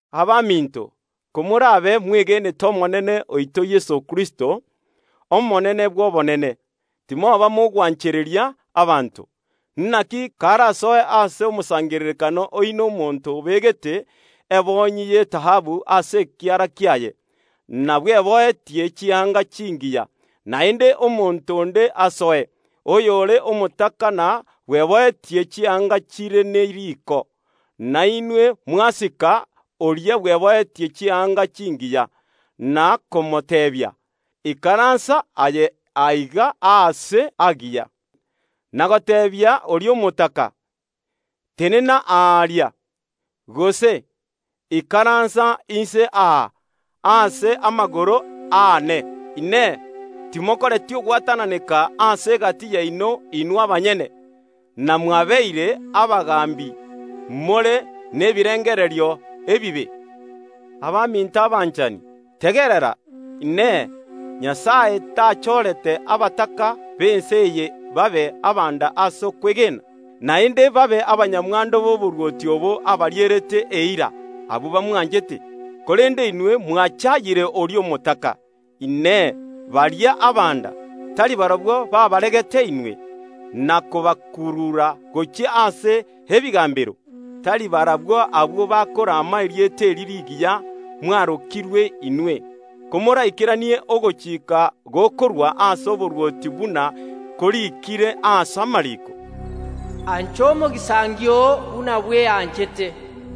Abaminto, komorabe mwegeenete Omonene oito Yeso Kristo, Omonene bw’obonene, timoba mogwanchereria abanto. Naki karasoe ase omosangererekano oino omonto obegete ebonyi y’etaabu ase ekiara kiaye, na bweboetie chianga chingiya, naende omonto onde asoe, oyore omotaka na bweboetie chianga chire ne riko, na inwe mwasika oria bweboetie chianga chingiya, na komoteebia “Ikaransa aye aiga aase aagiya” na goteebia oria omotaka, “Tenena aaria”, gose, “Ikaransa inse aa ase amagoro aane”, Inee, timokoreti ogwatananeka ase egati yaino inwe abanyene, na mwabeire abagaambi, more nebirengererio ebibe? Abaminto abanchani, tegerera! Inee! Nyasae tachorete abataka b’ense eye babe abanda ase okwegena, naende babe abanyamwando b’oborwoti obo abarierete eira, abwo bamwanchete? Korende inwe mwachayire oria omotaka. Inee! Baria abanda, tari barabwo baabaregete inwe, na kobakurura gochia ase ebigambero? Tari barabwo abwo bakorama erieta erio rigiya mwarokirwe inwe? Komoraikeranie ogochika gokorwa ase oborwoti buna koriikire ase amariiko, “Ancha omogisangio oo buna bweanchete”.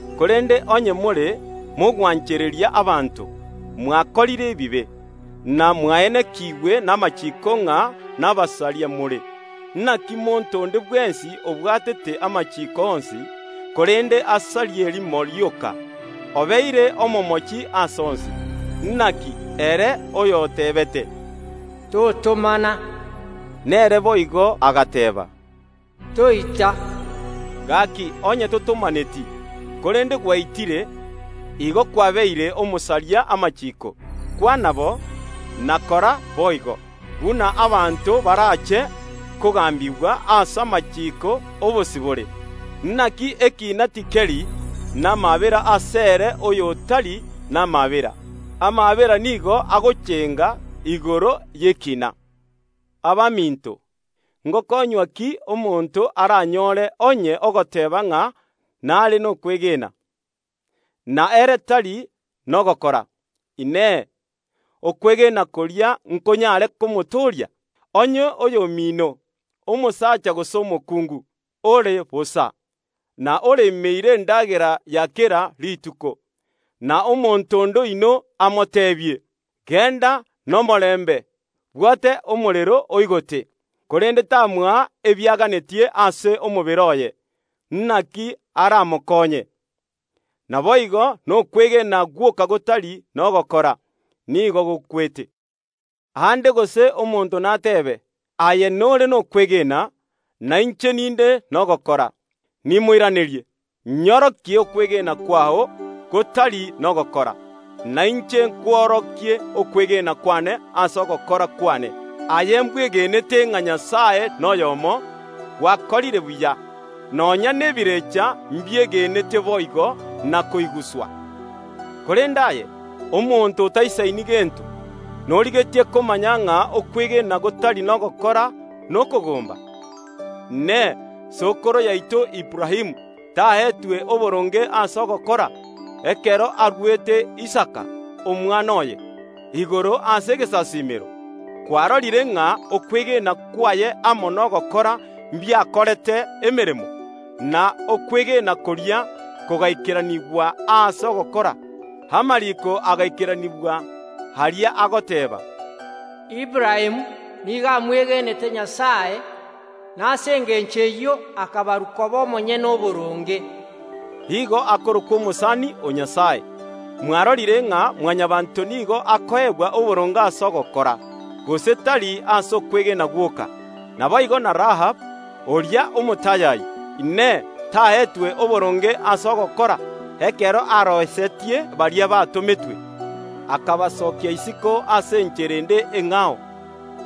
Korende onye more mogwanchereria abanto, mwakorire ebibe, na mwaenekigwe namachiiko ng’a nabasaria more. Naki monto onde bwensi obwatete amachiiko onsi, korende asarie erimo rioka, obeire omomochi ase onsi. Naki ere oyotebete, “Totomana”, nere boigo agateeba, “Toita”. Gaki, onye totomaneti, korende gwaitire, igo kwabeire omosaria amachiiko. Kwana bo, na kora boigo, buna abanto barache kogambigwa ase amachiiko obosibore. Naki ekiina tikeri namaabera asere oyotari namaabera. Amaabera nigo agochenga igoro y’ekina. Abaminto, ngokonywa ki omonto aranyore onye ogoteeba ng’a nare nokwegena, na ere tari nogokora? Inee! Okwegena koria nkonyare komotooria? Onye oyomino, omosacha gose omokungu, ore bosa, na oremeire endagera ya kera rituko, na omonto onde oino amoteebie, “Genda nomorembe, bwote omorero, oigote”, korende tamoa ebiaganetie ase omobere oye, naki aramokonye? Naboigo nokwegena gwoka gotari nogokora, nigo gokwete. Aande gose omonto nateebe, “Aye nore nokwegena, na inche ninde nogokora.” Nimoiranerie, “Nyorokia okwegena kwao gotari nogokora, na inche nkworokie okwegena kwane ase ogokora kwane.” Aye mbwegenete ng’a Nyasae noyomo; gwakorire buya. Nonya nebirecha mbiegeneete boigo na koiguswa. Korende aye, omoriri, norigetie komanya ng’a okwegena gotari nogokora nigo kore bosa? Inee! Sokoro yaito Aburaamu taetwe oboronge ase ogokora, ekero aruete Isaka, omwana oye, igoro ase egesasiimero? Kwarorire ng’a okwegena kwaye amo nogokora mbiakorete emeremo, na okwegena koria kogaikeranigwa ase ogokora. Amariko agaikeranigwa, aria agoteeba, “Aburaamu nigo amwegeenete Nyasae, na ase engencho eyio akabarwa koba omonyene oboronge.” Igo akarokwa omosani o Nyasae. Mwarorire ng’a Mwanyabaanto nigo akoegwa oboronge ase ogokora, gose tari ase okwegena gwoka. Naboigo na Rahabu, oria omotayayi, Inee, taetwe oboronge ase ogokora, ekero aroisetie baria batometwe, akabasokia isiko ase enchera ende eng’ao?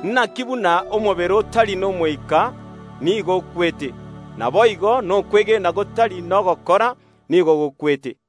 Naki buna omobere otari n’Omoika nigo okwete, naboigo nokwegena gotari nogokora nigo gokwete.